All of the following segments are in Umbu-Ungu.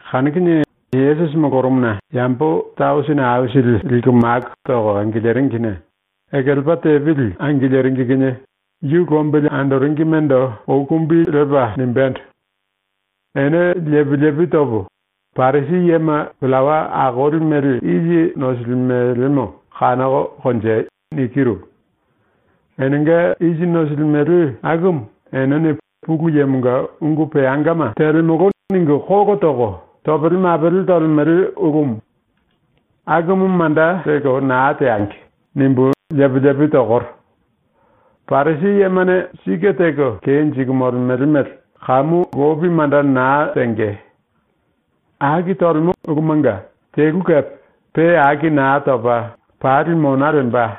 Kanu kinie Yesusi molorumuna yambo tausini aisili liku maku toko angiliringine ekelepa tepili angiliringi kinie yu lombili andoringimendo ou kumbi lepa nimbendo: “Ene lepi lepi topo, ‘Parisi yema pillawa akoli mele isi nosilimelemo kanoko konjei.’ nikiru. Enenga isi nosilimele akumu enene ⸤“Pulu Yemonga ulu peangama telemolo.” ningu⸥ kolo toko topele mapele tolemele ulumu. ⸤‘Akumu manda lelko naa teangi.’⸥ nimbu lepi lepi tokoro. ⸤Parisi yemane sike teko kenjiku molemele mele kamu lopi manda naa tenge.⸥ Aki tolemo ulumanga telu kepe pe aki naa topa pali mona lemba.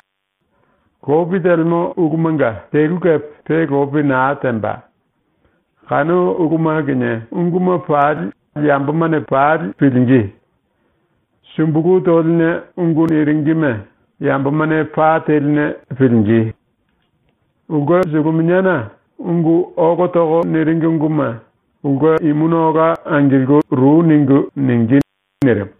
Lopi telemo ulumanga telu kepe pe lopi naa temba. Kanu uluma kinie unguma pali yambomane pali pilingí. Sumbulu toline ungu niringime yambomane pa teline pilingí. Ulke suluminiana ungu ólo toko niringi unguma ulke imuna ola angilku ru ningu ningí.” ⸤nirimu.⸥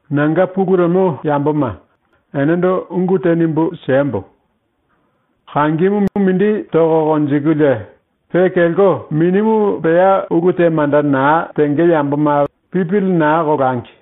“Nanga pulu lemo yamboma, enendo ungu te nimbu siembo: Kangimu mindi toko konjikulie pe kelko minimu pea ulu te manda naa tenge yamboma pipili naa kolangi.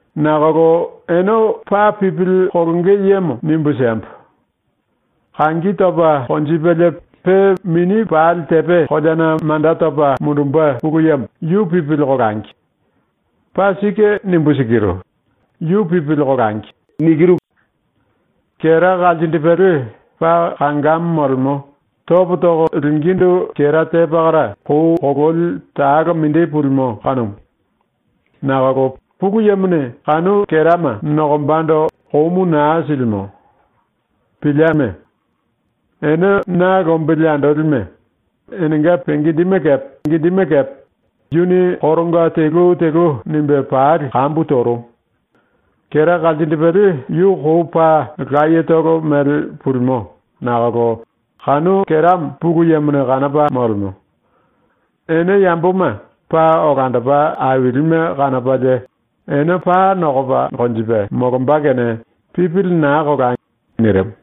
Nakolo ene paa pipili kolonge yemo nimbu siembo: Kangi topa konjipelie pe mini pali tepe koleana manda topa mundumbe ⸤Pulu Yemo⸥ yu pipili kolangi. Paa sike nimbu sikiru. Yu pipili kolangi. “Kera kalsindipele paa kangamo molemo, topo toko lingíndu kera te pakara kou kololi talo mindi pulimo kanumu. Nakolo Pulu Yemone kanu kerama nokombando komu naa silimo. Pilieme! Ene ⸤na lombili andolime⸥, enenga penge indime kepe yuni koronga telu telu nimbe pali kambu torumu. Kera kalsindipele yu kou paa layetolo mele pulimo nakolo kanu keramo Pulu Yemone kanopa molemo. Ene yamboma paa olandopa ailime kanopalie ene paa nokopa konjipe molomba ⸤kene pipili naa kolai.⸥” ⸤nirimu.⸥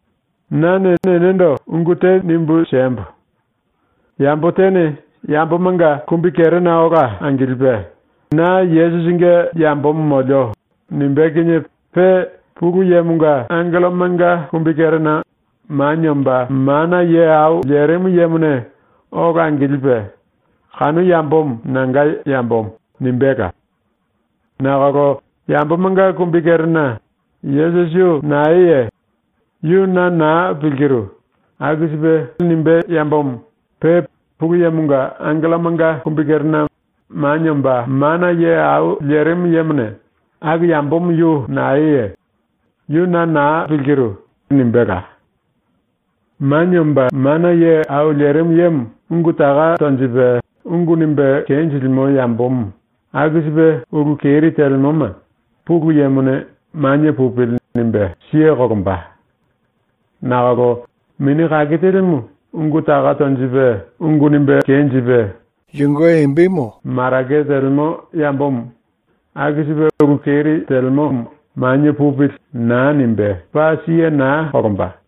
“Nane enendo ungu te nimbu siembo: Yambo tene yambomanga kumbikerena ola angilipe ‘Na Yesusinge yambomo molio.’ nimbé kinie pe Pulu Yemonga angellomanga kumbikerena Manie Omba Mana Ye Au Lerimu Yemone ola angilipe “Kanu yambomo nanga yambomo.” nimbéla. Nakolo yambomanga kumbikerena “Yesusi yu naeye? Yu na naa pilkiru.” aku mele nimbé yambomo pe Pulu Yemonga angellomanga kumbikerena Manie Omba Mana Ye Au Lerimu Yemone “Aku yambomo yu naeye? Yu na naa pilkiru.” nimbéla. “Manie Omba Mana Ye Au Lerimu Yemo ungu taka tonjipe ungu nimbe kenjilimo yambomo aku sipe ulu keri telemoma ⸤Pulu Yemone⸥ ‘Manie pupili.’ nimbe siye kolomba. Nakolo Mini Kake Telimu ungu taka tonjipe, ungu nimbe kenjipe, marake telemo yambomo aku sipe ulu keri telemomo ‘Manie pupili.’ naa nimbe, paa siye naa kolomba.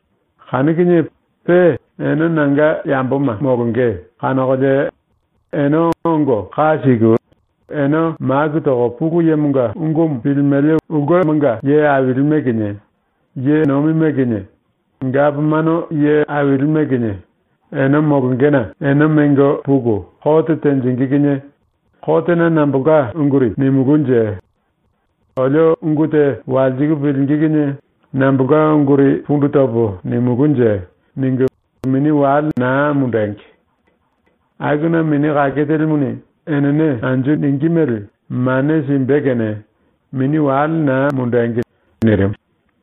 “Kanu kinie pe ene ⸤nanga yamboma molonge kanokolie⸥ ene ongo ka siku, ene maku toko Pulu Yemonga ungumu pilimele ulkemanga ye ailime kinie, ye nomime kinie, gapomano ye ailime kinie ene molongena ene mengo puku kote tenjingí kinie ‘Kotena nambolka unguri nimulúnje? Olio ungu te walsiku pilingí kinie nambolka unguri pundu topo nimulúnje?’ ningu mini wale naa mundengi. Akuna Mini Kake Telimuni enene anju ningí mele mane simbe kene mini wale naa mundengi.” nirimu.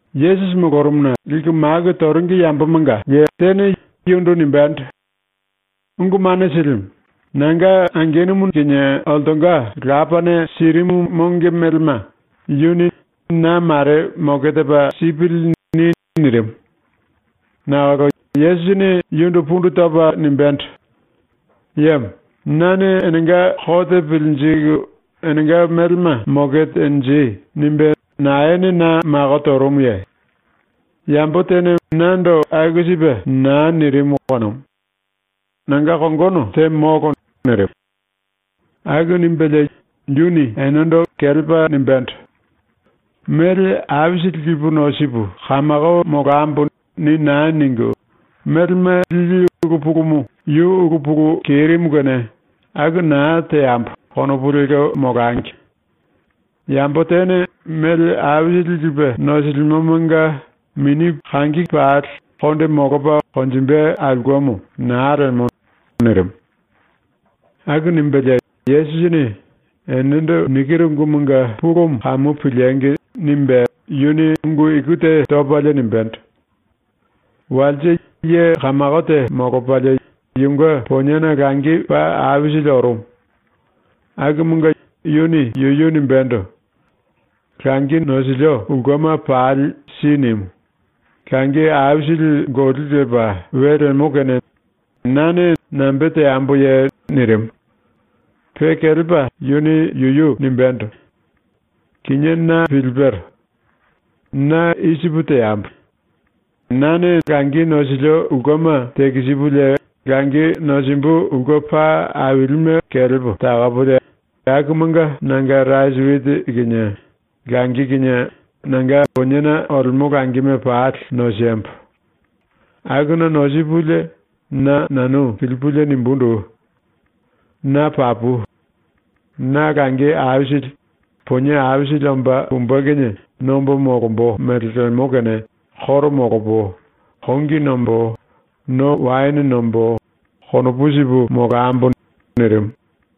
Yesusi molorumuna liku maku toringi yambomanga tene yundu nimbendo: “Ungu Mane Silimu, nanga angenumu kinie oltonga lapane sirimu monge melema yuni ‘Na mare moke tepa sipili.’ ni.” nirimu. Nakolo Yesusini yundu pundu topa nimbéndo: “Yemo, ‘Nane enenga kote pilinjiku enenga melema moke tenji.’ nimbe naene na mako torumuye? Yambo tene nando aku sipe naa nirimu kanumu. Nanga kongono te molo.” nirimu. Aku nimbelie yuni enendo kelepa nimbendo: “‘Mele aisili lipu nosipu kamako molambo.’ ni naa ningu, ‘Melema lili ulu pulumu yu ulu pulu kerimu kene aku naa teambo.’ konopu lelko molangi. Yambo tene mele aisili lipe nosilimomonga mini pali konde molopa konjimbe aulkemo naa lemo.” nirimu. ⸤Aku nimbelie Yesusini ‘Enendo nikiru ungumanga pulumu kamu piliengi!’ nimbe⸥ yuni ungu iku te topalie nimbendo: “Walse ye kamako te molopalie yunge poniena langi paa aisili orumu. Akumunge yuni yuyu nimbendo: “Langi nosilio ulkema pali si nimu, langi aisili goli lepa we lemo kene na nambe teamboye?” nirimu. Pe kelepa yuni yuyu nimbendo: “Kinié na pilipero. Na i sipu teambo. Na langi nosilio ulkema tekisipulie langi nosimbu ulke paa ailime kelepo takopolie akumanga nanga rasi witi kinie langi kinie nanga poniena olemo langime pali nosembo. Akuna nosipulie na nanu pilipulie nimbundu: Na papu. Na langi aisili, ponie aisili omba pumbe kinie nombo molombo mele lemo kene koro molopo, kongi nombo, no waene nombo, konopu sipu molambo.” nirimu.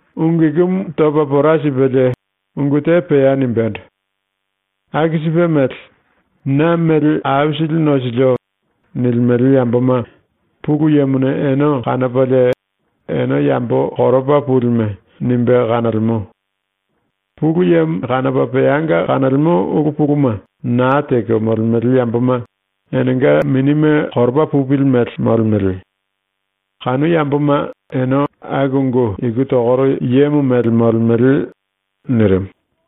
⸤Ungu ikumu topa pora sipelie ungu te pea nimbendo:⸥ “Aku sipe mele, ‘Na mele aisili nosilio.’ nilimele yamboma Pulu Yemone ene kanopalie ene yambo koropa pulime nimbe kanolemo. Pulu Yemo kanopa peanga kanolemo ulu puluma naa teko molemele yamboma enenga minime koropa pupili mele molemele. Kanu yamboma ene aku ungu iku tokoro yemo mele molemele.” nirimu.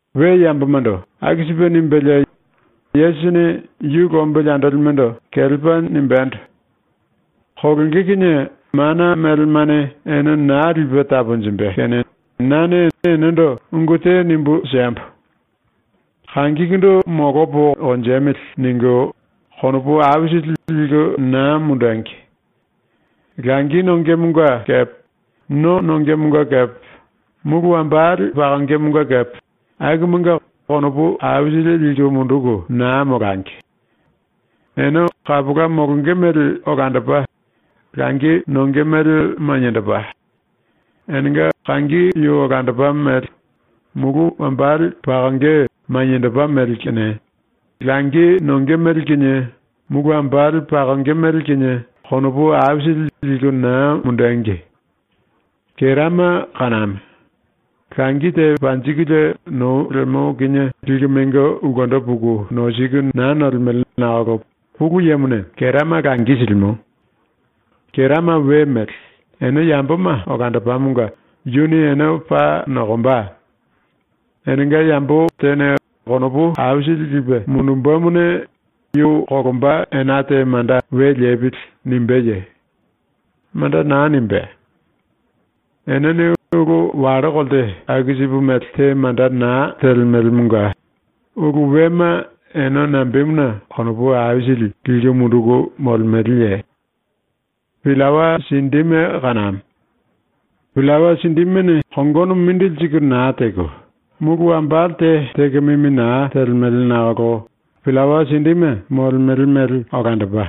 ⸤We yambomando⸥ aku sipe nimbelie Yesusini yu lombili andolimendo kelepa nimbendo: “⸤Kolonge kinie mana melemane ene naa lipe taponjimbe⸥ kene nane enendo ungu te nimbu siembo: ‘Kangikundu molopo konjemili.’ ningu konopu aisili liku naa mundengi. Langi nongemonga kepe no nongemonga kepe mulu wambale pakongemonga kepe akumanga konopu aisili liku munduku naa molangi. Ene kapola molonge mele olandopa, langi nonge mele maniendopa; enenga kangi yu olandopa mele, mulu wambale pakonge maniendopa mele kene langi nonge mele kinie, mulu wambale pakonge mele kinie, konopu aisili liku naa mundengi. Kerama kaname. Langi te panjikulie nou lemo kinie liku mengo ulkendo puku nosiku naa nolemele nakolo Pulu Yemone kerama langi silimo. Kerama we mele, ene yamboma olandopamonga yuni ene paa nokomba. Enenga yambo tene konopu aisili lipe mundumbemone yu kolomba ena te manda ‘We lepili.’ nimbéye? Manda naa nimbé. Enene ulu wallo kolte aku sipe mele te manda naa telemelemonga ulu wema ene nambemuna konopu aisili liku munduku molemeleye? “Pillawa sindime kaname. Pillawa sindimene kongono mindili siku naa teko, mulu wambale te teko mimi naa telemele nakolo pillawa sindime molemele mele olandopa,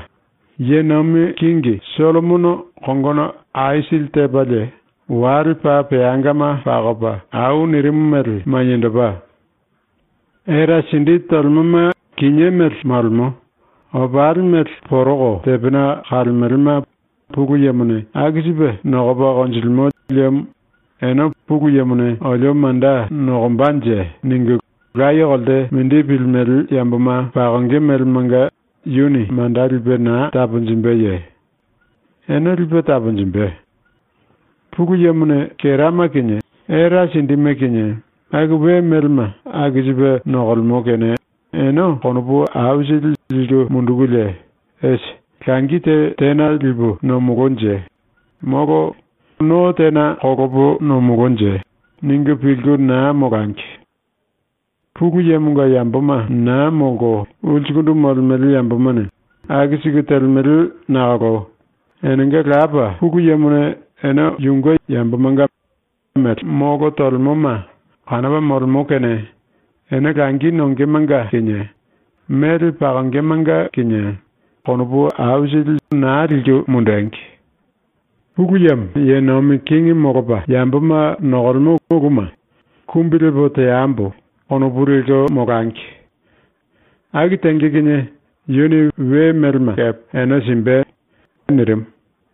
⸤ye nomi kingi⸥ Sollomono kongono aisili tepalie wale paa peangama pakopa au nirimu mele maniendopa. Era sindi tolemoma kinié mele molemo, opali mele poroko tepena kalemelema Pulu Yemone aku sipe nokopa konjilimo liemo ene ‘Pulu Yemone olio manda nokombanje?’ ningu laye kolte mindi pilimele yamboma pakonge melemanga yuni manda lipe naa taponjimbeye? Ene lipe taponjimbe. “⸤Pulu Yemone kerama kinie era sindime kinie aku we melema aku sipe nokolemo⸥ kene ene konopu aisili liku mundukulie ‘Esi, langi te tena lipu nomolonje?’; molo ‘No tena kolopo nomolonje?’ ningu pilku naa molangi. Pulu Yemonga yamboma naa molko ulsukundu molemele yambomane aku siku telemele nakolo enenga Lapa ⸤Pulu Yemone⸥ ene yunge yambomanga mele molo tolemoma kanopa molemo ⸤kene ene langi nongemanga kinie mele pakongemanga kinie konopu naa liku mundengi⸥. ⸤Pulu Yemo⸥ ye nomi kingi molopa yamboma nokolemo uluma ‘Kumbi lepo teambo.’ konopu lelko molangi. Aku tenge kinie yuni we melema kepe ene simbe.” ⸤nirimu.⸥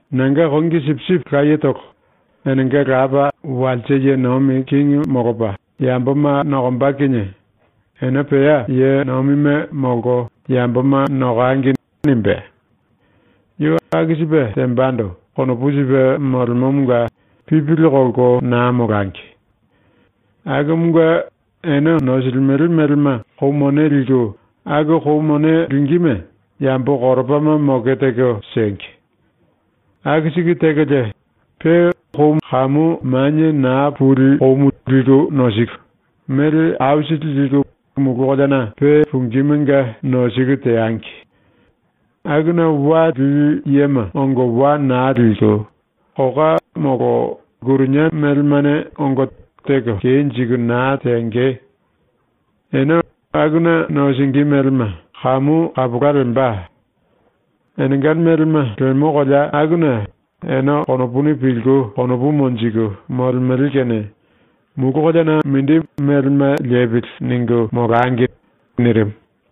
“Nanga kongi sipisipi layetolo, enenga Lapa walse ye nomi kingi molopa yamboma nokomba kinie ‘Ene pea ye nomime molko yamboma nokangi.’ nimbé. Yu aku sipe tembando konopu sipe molemomonga pipili kolko naa molangi. Akumunge ene nosilimele melema kou mone liku aku kou mone lingíme yambo koropama moke teko siengi. Aku siku tekolie pe kou kamu manie naa puli koumu liku nosiku, mele aisili liku mulu koleana ⸤pe pungímunge⸥ nosiku teangi. Akuna wa lili yema ongo wa naa liku, koka molo lkurinia melemane ongo teko kenjiku naa tenge. Ene akuna nosingí melema kamu kapola lemba. Enenga nosilimele melema lemo kolea akuna ene konopuni pilku konopu monjiku molemele kene ⸤‘mulu koleana mindi melema lepili.’ ningu molangi.” nirimu⸥.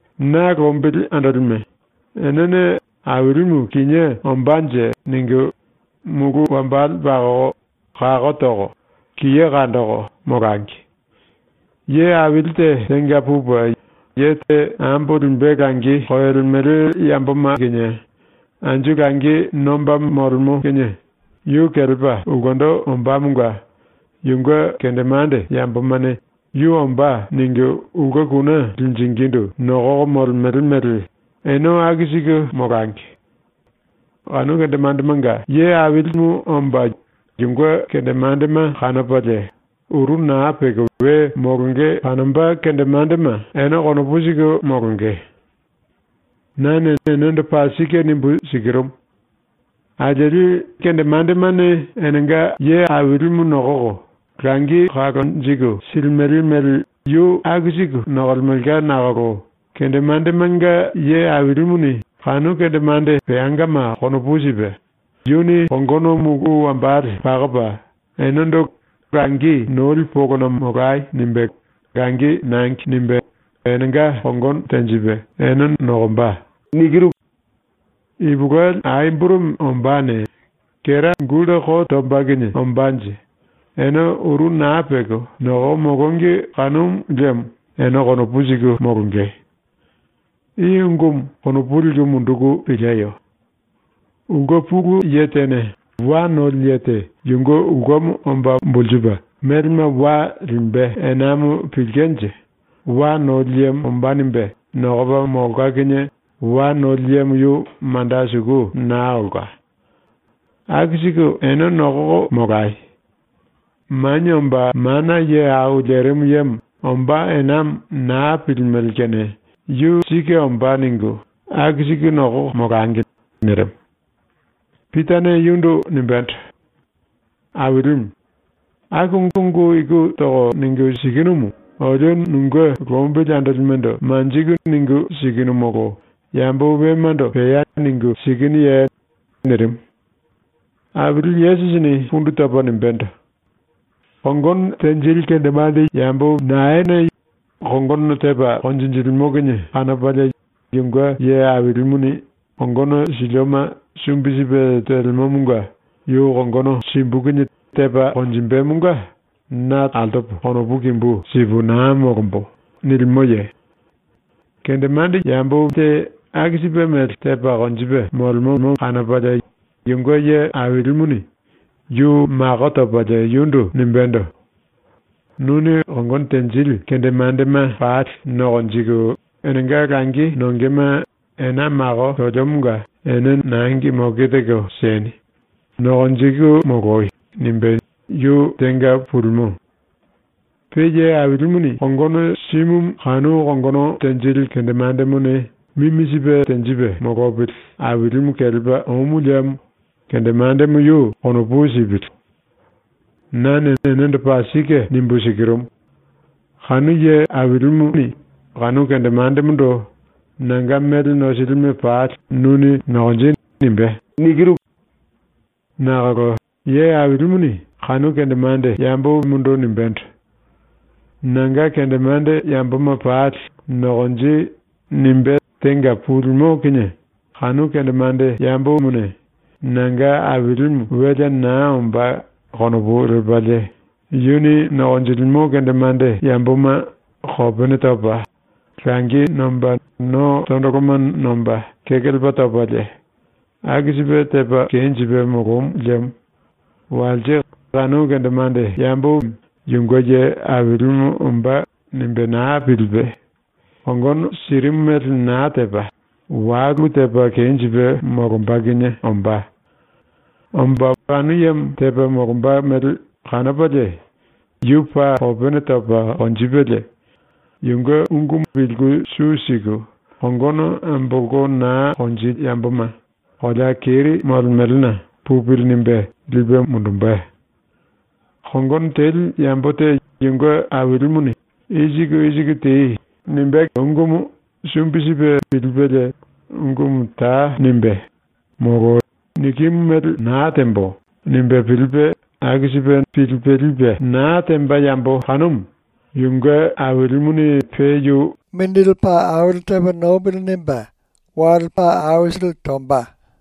“⸤Na lombili andolime,⸥ enene ‘Ailimu kinié ombánje.’ ningu mulu wambale pakoko, kako toko, kiye kandoko, molangi. Ye aili te tenga pupe ye te ambo limbe langi koyolemele yamboma kinie anju langi nomba molemo kinie yu kelepa ulkendo ombámonga yunge kendemande yambomane ‘Yu ombá.’ ningu ulke kune linjingindu nokoko molemele mele ene aku siku molangi. Kanu kendemandemanga nokolimu omba yunge kendemandema kanopalie, uru naa peko we molonge kanomba kendemandema ene konopu siku molonge. “Nane enendo paa sike nimbu sikirumu: ⸤Alieli kendemandemane enenga ailimu nokoko langi kalonjiku silimele mele yu aku siku nokolemelka nakolo kendemandemanga⸥ ye ailimuni ⸤kanu kendemande peangama konopu sipe⸥ yuni kongono mulu wambale pakopa enendo “Langi noli polona molai.” nimbe ‘Langi nangi.’ nimbe enenga kongono tenjipe ene nokomba. Ipulueli ai burumi ombáne, kera gulta ko tomba kinie ombánje, ene uru naa peko nokoko molongi kanomu liemo ene konopu siku molonge. “I ungumu konopu liku munduku pilieyo. Ulke pulu ye tene wa noli ye te yunge ulkemo omba bulsupe melema wa limbe enamo pilkenje ‘Wa noli yemo ombá.’ nimbe nokopa molka kinie wa noli yemo yu manda suku naa olka. Aku siku ene nokoko molai. Manie Omba Mana Ye Au Lerimu Yemo ombá enamo naa pilimele kene ‘Yu sike ombá.’ ningu aku siku nokoko molangi.” nirimu. Pitane yundu nimbendo: “Ailimu, aku ungu iku toko ningu sikinumu olio ⸤nunge lombili andolimendo manjiku⸥ ningu sikinu molo yambo wemando pea ningu sikinuye?” nirimu. Aili Yesusini pundu topa nimbendo: “Kongono tenjili kendemande ye naene kongono tepa konjinjilimo kinie kanopalie yunge ye ailimuni ‘Yuni kongono silioma sumbi sipe telemomonga yu kongono simbu kinie tepa konjimbemonga na altopo konopu kimbu sipu naa molombo.’ nilimoye? Kendemande ye te aku sipe mele tepa konjipe molemomo kanopalie yunge ye ailimuni yu mako topalie yundu nimbendo: “Nuni kongono tenjili kendemandema pali nokonjiku enenga langi nongema ena mako toliomonga ene nangi moke teko sieni, nokonjiku moloi.” nimbe ⸤yu tenga pulimo⸥. Pe ye ailimuni kongono simumu kanu kongono tenjili kendemandemone mimi sipe tenjipe molopili ailimu kelepa omu liemo kendemandemo yu konopu sipili. Nane enendo paa sike nimbu sikirumu: Kanu ye ailimuni kanu kendemandemondo “Nanga mele nosilioma pali nuni nokonji.” nimbé. “Nakolo ⸤ye ailimuni kanu kendemande yemondo nimbendo: “Nanga kendemande yamboma pali nokonji.” nimbe tenga pulimo kinie⸥ kanu kendemande yemone “Nanga ailimu welea naa ombá.” konopu lepalie yuni nokonjilimo kendemande yamboma kopene topa, langi nomba no tondoloma nomba kekelepa topalie, aku sipe tepa kenjipe molomu liemo walse kanu kendemande yemo ‘Yunge ye ailimu ombá.’ nimbe naa pilipe ⸤kongono sirimu mele naa tepa⸥ walu tepa kenjipe molomba kinie ombá. Omba ⸤kanu yemo tepa molomba mele kanopalie⸥ yu paa kopene topa konjipelie, yunge ungumu pilku su siku kongono ambolko naa konjili yamboma ⸤kolea keri⸥ molemelena ‘Pupili.’ nimbe lipe mundumbe. “Kongono teli yambo te yunge ailimuni “I siku i siku tei.” nimbé ungumu sumbi sipe pilipelie ungumu ta nimbé, molo ‘Nikimu mele naa tembo.’ nimbe pilipe aku sipe pilipe lipe naa temba yambo kanumu yunge ailimuni pe yu mongo paa aisili simbe.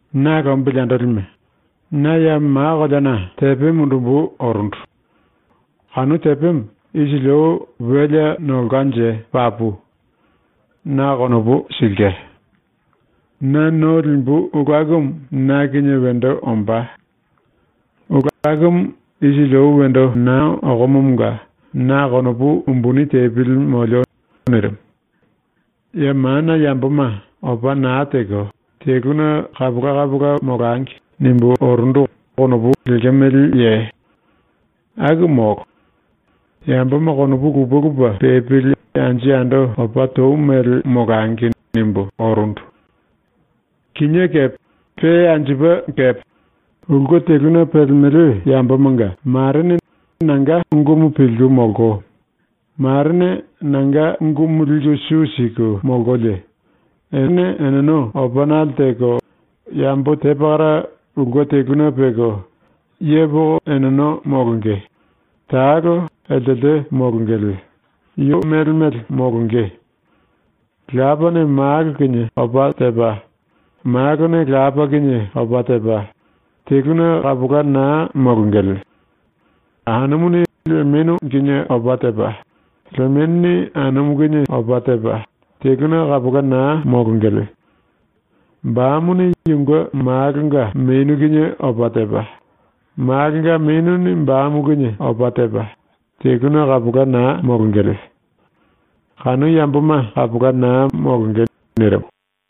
“⸤Na lombili andolime,⸥ na ya ma koleana tepe mundumbu orundu. Kanu tepemo isili ou welea nolkanje papu. Na konopu silke. “Na no limbu ulu akumu na kinie wendo ombá. Ulu akumu isili ou wendo naa okomomonga na konopu umbuni tepili molio.” ⸤nirimu.⸥ “‘Ya mana yamboma opa naa teko teluna kapola kapola molangi.’ nimbu orundu konopu lekemeleye? Aku molo. ‘Yamboma konopu lupe lupe pepili anju yando opa tou mele molangi.’ nimbu orundu. Kinié kepe pe anjupe kepe ulke teluna pelemele yambomanga ⸤marene nanga ungumu pilku molko marene nanga ungumu liku su siku molkolie,⸥ ene eneno opanale teko yambo te pakara ulke teluna peko, yepoko eneno molonge, talo eltelte molongele, yu mele mele molonge. Lapane malo kinie opa tepa, malone lapa kinie opa tepa, teluna kapola naa molongele. Anumuni lemenu kinie opa tepa, lemenuni anumu kinie opa tepa, teluna kapola naa molongele. Bamuni yunge malonga menu kinie opa tepa, malonga menuni bamu kinie opa tepa, teluna kapola naa molongele. ⸤Kanu yamboma kapola naa molonge.⸥” nirimu.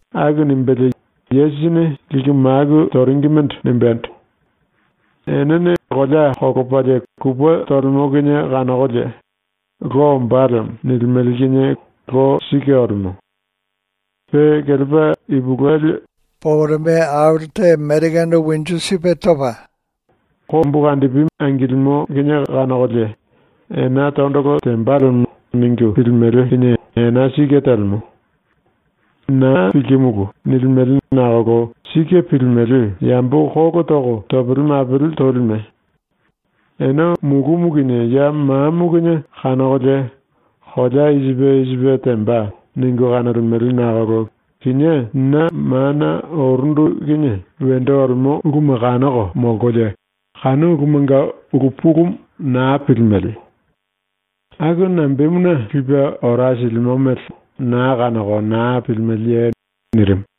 Aku nimbelie Yesusini liku maku toringimendo nimbendo: “Enene kolea kolopalie kupe tolemo kinie kanokolie “Lo ombá lemo.” nilimele kinie lo sike olemo. Pe kelepa ipulueli poporome topa, kombukandipi angilimo kinie kanokolie “Ena tondolo temba lemo.” ningu pilimele kinie ena sike telemo. “⸤Naa pilkimulu.” nilimele nakolo sike pilimele⸥ yambo kolo toko topele mapele tolime! Ene mulumu kinie ya mamo kinie kanokolie ‘kolea i sipe i sipe temba.’ ningu kanolemele nakolo kinié ⸤na mana orundu kinie⸥ wendo olemo uluma kanoko molkolie kanu ulumanga ulu pulumu naa pilimele. Aku nambemuna ⸤lipe ora silimo mele⸥ naa kanoko naa pilimeleye?” ⸤nirimu.⸥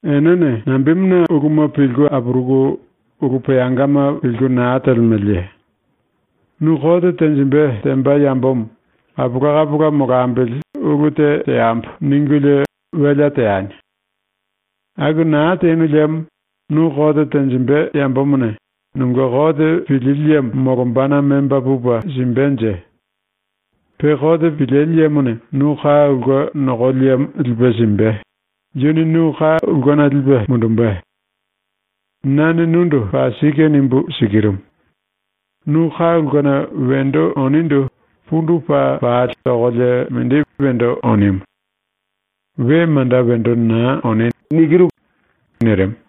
“Enene nambemuna uluma pilku apuruku ulu peangama pilku naa telemeleye? Nu kote tenjimbe temba yambomo ‘Kapola kapola molambili ulu te teambo.’ ningulie welea teani. Aku naa tenu liemo nu kote tenjimbe yambomone nunge kote pilili yemo molombana memba pupe simbenje? Pe kote pilili yemone nu ka ulke nokoli yemo lipe simbe, yuni nu ka ulkena lipe mundumbe. Nane nundu paa sike nimbu sikirumu: Nu ka ulkena wendo onindu pundu paa pali tokolie mindi wendo onimu. We manda wendo naa oni.” nirimu.